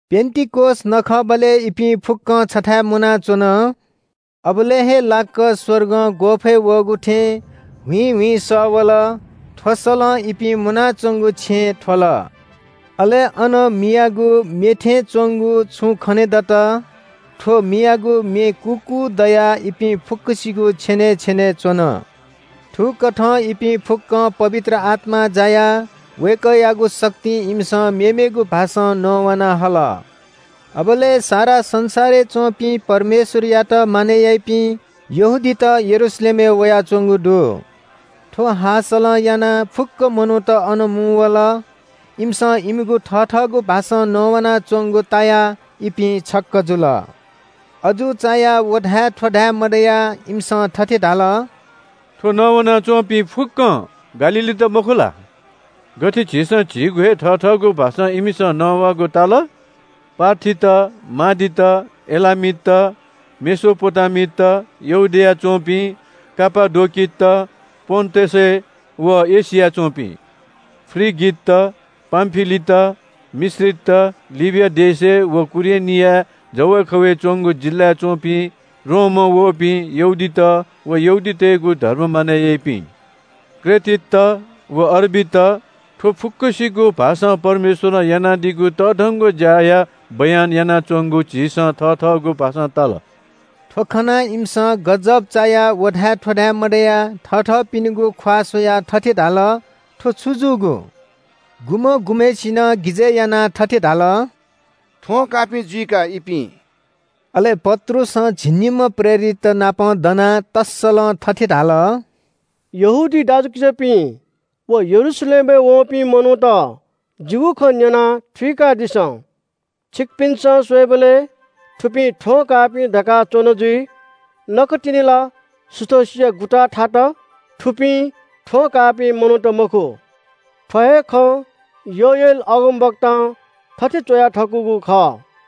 पेन्‍तिकोस नखःबलय् इपिं फुक्‍कं छथाय् मुनाच्‍वन। अबलय् हे लाक्‍क स्‍वर्गं ग्‍वःफय् वःगु थें ह्वीं ह्वीं सः वल। थ्‍व सलं इपिं मुनाच्‍वंगु छेँ थ्‍वल। अले अन मियागु मे थें च्‍वंगु छुं खनेदत। थ्‍व मियागु मे कूकू दयाः इपिं फुक्‍कसिगु छेनय् छेनय् च्‍वन। थुकथं इपिं फुक्‍कं पवित्र आत्‍मां जायाः वय्‌कःयागु शक्तिं इमिसं मेमेगु भाषां नवाना हल। अबलय् सारा संसारय् च्‍वंपिं परमेश्‍वरयात मानय् याइपिं यहूदीत यरूशलेमय् वयाच्‍वंगु दु। थ्‍व हाःसलं यानाः फुक्‍क मनूत अन मुंवल। इमिसं इमिगु थथःगु भाषां नवानाच्‍वंगु तायाः इपिं छक्‍क जुल। अजू चायाः व धाये थ्‍व धाये मदयाः इमिसं थथे धाल – “थ्‍व नवाना च्‍वंपिं फुक्‍कं गालीलीत मखु ला? गथे झीसं झीगु हे थथःगु भाषां इमिसं नवाःगु ताल? पार्थीत, मादीत, एलामीत, मेसोपोटामित, यहूदियाय् च्‍वंपिं, कापाडोकित, पोन्‍टसय् व एशियाय् च्‍वंपिं, फ्रिगित, पामफिलित, मिश्रीत, लिबिया देश व कुरेनीया जवय् खवय् च्‍वंगु जिल्‍लाय् च्‍वंपिं, रोमं वःपिं यहूदीत व यहूदीतय्‌गु धर्म मानय् याइपिं, क्रेटीत व अरबीत, थ्‍व फुक्‍कसिगु भाषां परमेश्‍वरं यानादीगु तःधंगु ज्‍याया बयान इमिसं यानाच्‍वंगु झीसं थथःगु भाषां ताल।” थ्‍व खनाः इमिसं गजब चायाः व धाये थ्‍व धाये मदयाः थथःपिनिगु ख्‍वाः स्‍वयाः थथे धाल – “थ्‍व छु जूगु?” गुम्‍ह गुम्‍हय्‌सिनं गिजय् यानाः थथे धाल – “थ्‍वं काःपिं जुइ का, इपिं?” अले पत्रुसं झिंनिम्‍ह प्रेरिततनापं दनाः तःसलं थथे धाल – “यहूदी दाजुकिजापिं व यरूशलेमय् वःपिं मनूत, जिगु खँ न्‍यनाः थुइकादिसँ। छिकपिन्‍सं स्‍वयेबलय् थुपिं थ्‍वं काःपिं धकाः च्‍वन जुइ। नकतिनि ला सुथसिया गुताः थात। थुपिं थ्‍वं काःपिं मनूत मखु। थ्‍व हे खँ योएल अगमवक्तां थथे च्‍वया थकूगु खः –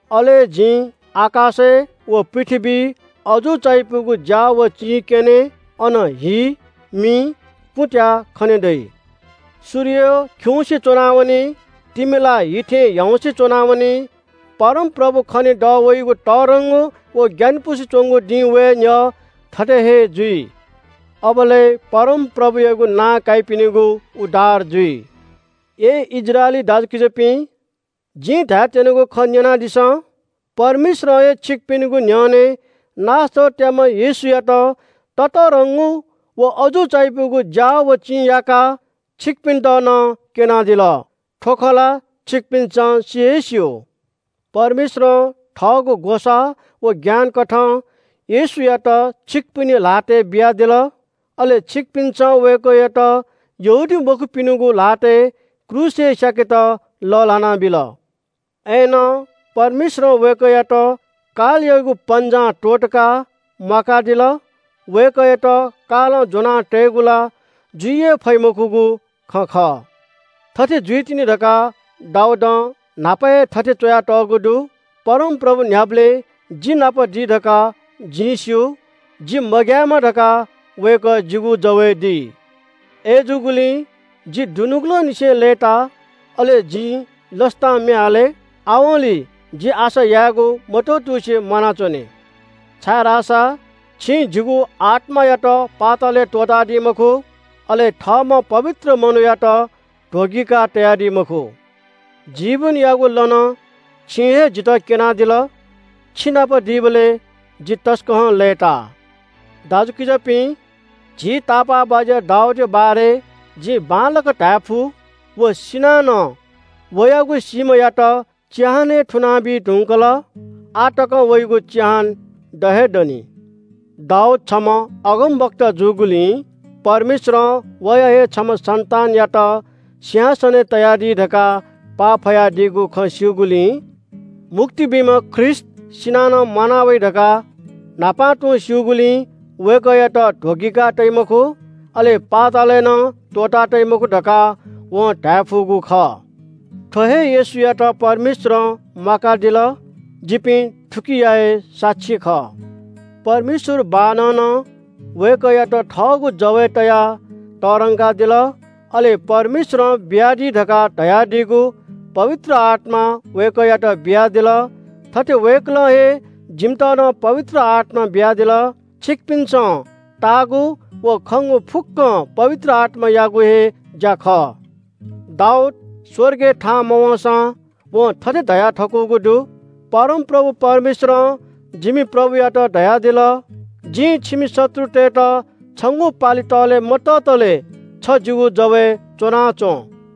अले आकाशय् व पृथ्‍वीइ जिं अजू चायापुगु ज्‍या व चिं क्‍यने। अन हि, मि, कुँत्‍याः खने दइ। सूर्य खिउँसे च्‍वनावनी। तिमिला हि थें ह्याउँसे च्‍वनावनी। परमप्रभु खने दःवइगु तःधंगु व ग्‍यानापुसे च्‍वंगु दिं वये न्‍ह्यः थथे हे जुइ। अबलय् परमप्रभुयागु नां काइपिनिगु उद्धार जुइ।’” “अय् इस्राएली दाजुकिजापिं, जिं धायेत्‍यनागु खँ न्‍यनादिसँ – परमेश्‍वरं हे छिकपिनिगु न्‍ह्यःने नासरतयाम्‍ह येशूयात ततःधंगु व अजू चायापुगु ज्‍या व चिं याकाः छिकपिन्‍त नं क्‍यनादिल। थ्‍व खँ ला छिकपिन्‍सं सि हे स्‍यू। परमेश्‍वरं थःगु ग्‍वसाः व ज्ञानकथं येशूयात छिकपिनि ल्‍हातय् बियादिल। अले छिकपिन्‍सं वय्‌कःयात अधर्मीतय्‌गु ल्‍हातय् क्रूसय् स्‍याकेत लःल्‍हाना बिल। अय्‌नं परमेश्‍वरं वय्‌कःयात कालयागु पन्‍जां त्‍वःतकाः म्‍वाकादिल। वय्‌कःयात कालं ज्‍वना तयेगु ला जुइ हे फइ मखुगु खँ खः। थथे जुइतिनि धकाः दाऊदं न्‍हापा हे थथे च्‍वयातःगु दु – “‘परमप्रभु न्‍ह्याबलें जि नाप दी धकाः जिं स्‍यू। जि मग्‍यायेमा धकाः वय्‌कः जिगु जवय् दी। अय्‌जूगुलिं जि दुनुगलंनिसें लय्‌ता, अले जिं लसतां म्‍ये हाले। आवंलि जि आशा यायेगु मत्‍वतुसे म्‍वानाच्‍वने, छाय्‌धाःसा छिं जिगु आत्‍मायात पातालय् त्‍वःतादी मखु। अले थःम्‍ह पवित्र मनूयात ध्‍वगिकाः तयादी मखु। जीवनयागु लँ नं छिं हे जितः क्‍यनादिल। छिनाप दीबलय् जि तसकं लय्‌ता।’” “दाजुकिजापिं, झी तापाःबाज्‍या दाऊदया बारे जिं बांलाक धायेफु – व सिनाः नं वयागु सीम्‍हयात चिहानय् थुनाबी धुंकल। आः तकं वयागु चिहान द हे दनि। दाऊद छम्‍ह अगमवक्ता जूगुलिं, परमेश्‍वरं वया हे छम्‍ह सन्‍तानयात सिंहासनय् तयादी धकाः पाफयादीगु खँ स्‍यूगुलिं, मुक्ति बीम्‍ह ख्रीष्‍ट सिनाः नं म्‍वाना वइ धकाः न्‍हापां तुं स्‍यूगुलिं वय्‌कःयात ध्‍वगिका तइ मखु, अले पातालय् नं त्‍वःता तइ मखु धकाः वं धाये फुगु खः। “थ्‍व हे येशूयात परमेश्‍वरं म्‍वाकादिल। जिपिं थुकिया हे साक्षी खः। परमेश्‍वर बाःनं नं वय्‌कःयात थःगु जवय् तयाः तःधंकादिल। अले परमेश्‍वरं बियादी धकाः धयादीगु पवित्र आत्‍मा वय्‌कःयात बियादिल। थथे वय्‌कलं हे जिमित नं पवित्र आत्‍मा बियादिल। छिकपिन्‍सं ताःगु व खंगु फुक्‍कं पवित्र आत्‍मायागु हे ज्‍या खः। दाऊद स्‍वर्गय् थाहां मवंसां वं थथे धयाथकूगु दु – “‘परमप्रभु परमेश्‍वरं जिमि प्रभुयात धयादिल – जिं छिमि शत्रुतय्‌त छंगु पालि तःले मततले छ जिगु जवय् च्‍वनाच्‍वँ।’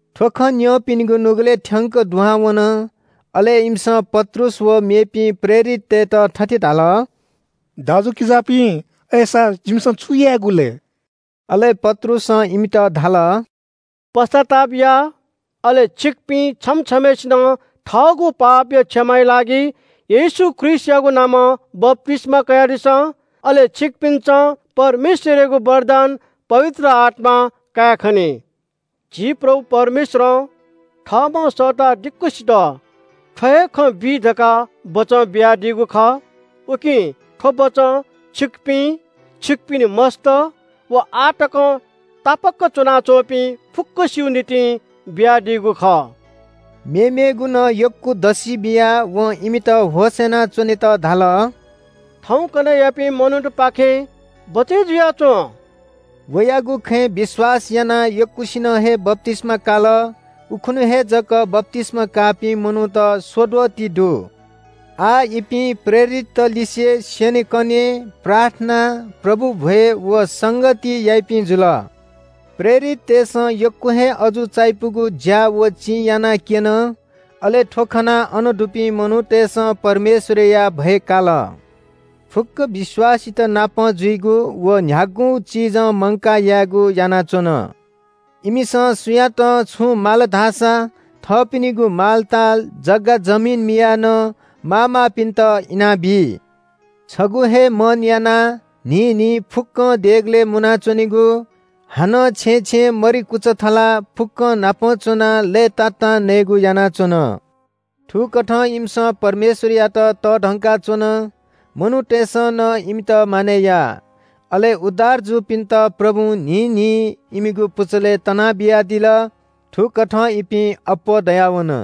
थ्‍व खँ न्‍यंपिनिगु नुगलय् थ्‍यंक दुहां वन। अले इमिसं पत्रुस व मेपिं प्रेरिततय्‌त थथे धाल – “दाजुकिजापिं, अय्‌सा जिमिसं छु यायेगु लय्?” अले पत्रुसं इमित धाल – “पश्‍चाताप या, अले छिकपिं छम्‍ह छम्‍हय्‌सिनं थःगु पापया क्षमा या लागि येशू ख्रीष्‍टयागु नामं बप्‍तिस्‍मा कयादिसँ। अले छिकपिन्‍सं परमेश्‍वरयागु वरदान पवित्र आत्‍मा कायेखनी। झी प्रभु परमेश्‍वरं थःम्‍हं सःता दिक्‍वसित थ्‍व हे खँ बी धकाः बचं बियादीगु खः। उकिं थ्‍व बचं छिकपिं, छिकपिनि मस्‍त व आः तकं तापाक च्‍वनाच्‍वंपिं फुक्‍कसिगु निंतिं बियादीगु खः।” मेमेगु नं यक्‍व दसि बियाः वं इमित होश यानाच्‍वनेत धाल – “थौंकन्‍हय्‌यापिं मनूतपाखें बचय् जुयाच्‍वँ।” वयागु खँय् विश्‍वास यानाः यक्‍वसिनं हे बप्‍तिस्‍मा काल। उखुन्‍हु हे जक बप्‍तिस्‍मा काःपिं मनूत स्‍वद्वः ति दु। आः इपिं प्रेरितत लिसे स्‍यनेकने, प्रार्थना, प्रभु भ्‍वय् व संगति याइपिं जुल। प्रेरिततय्‌सं यक्‍व हे अजू चायापुगु ज्‍या व चिं यानाक्‍यन। अले थ्‍व खनाः अन दुपिं मनूतय्‌सं परमेश्‍वरया भय काल। फुक्‍क विश्‍वासीतनापं जुइगु व न्‍ह्यागु चिजं मंकाः यायेगु यानाच्‍वन। इमिसं सुयातं छुं माल धाःसा थःपिनिगु मालताल, जग्‍गा जमिन मियाः नं माःमाःपिन्‍त इनाबी। छगू हे मन यानाः न्‍हिं न्‍हिं फुक्‍कं देगलय् मुना च्‍वनेगु, हानं छेँय् छेँय् मरि कुचा थलाः फुक्‍कंनापं च्‍वनाः लय्‌तातां नयेगु यानाच्‍वन। थुकथं इमिसं परमेश्‍वरयात तःधंका च्‍वन। मनूतय्‌सं नं इमित मानय् या। अले उद्धार जूपिन्‍त प्रभुं न्‍हिं न्‍हिं इमिगु पुचलय् तना बियादिल। थुकथं इपिं अप्‍वः दयावन।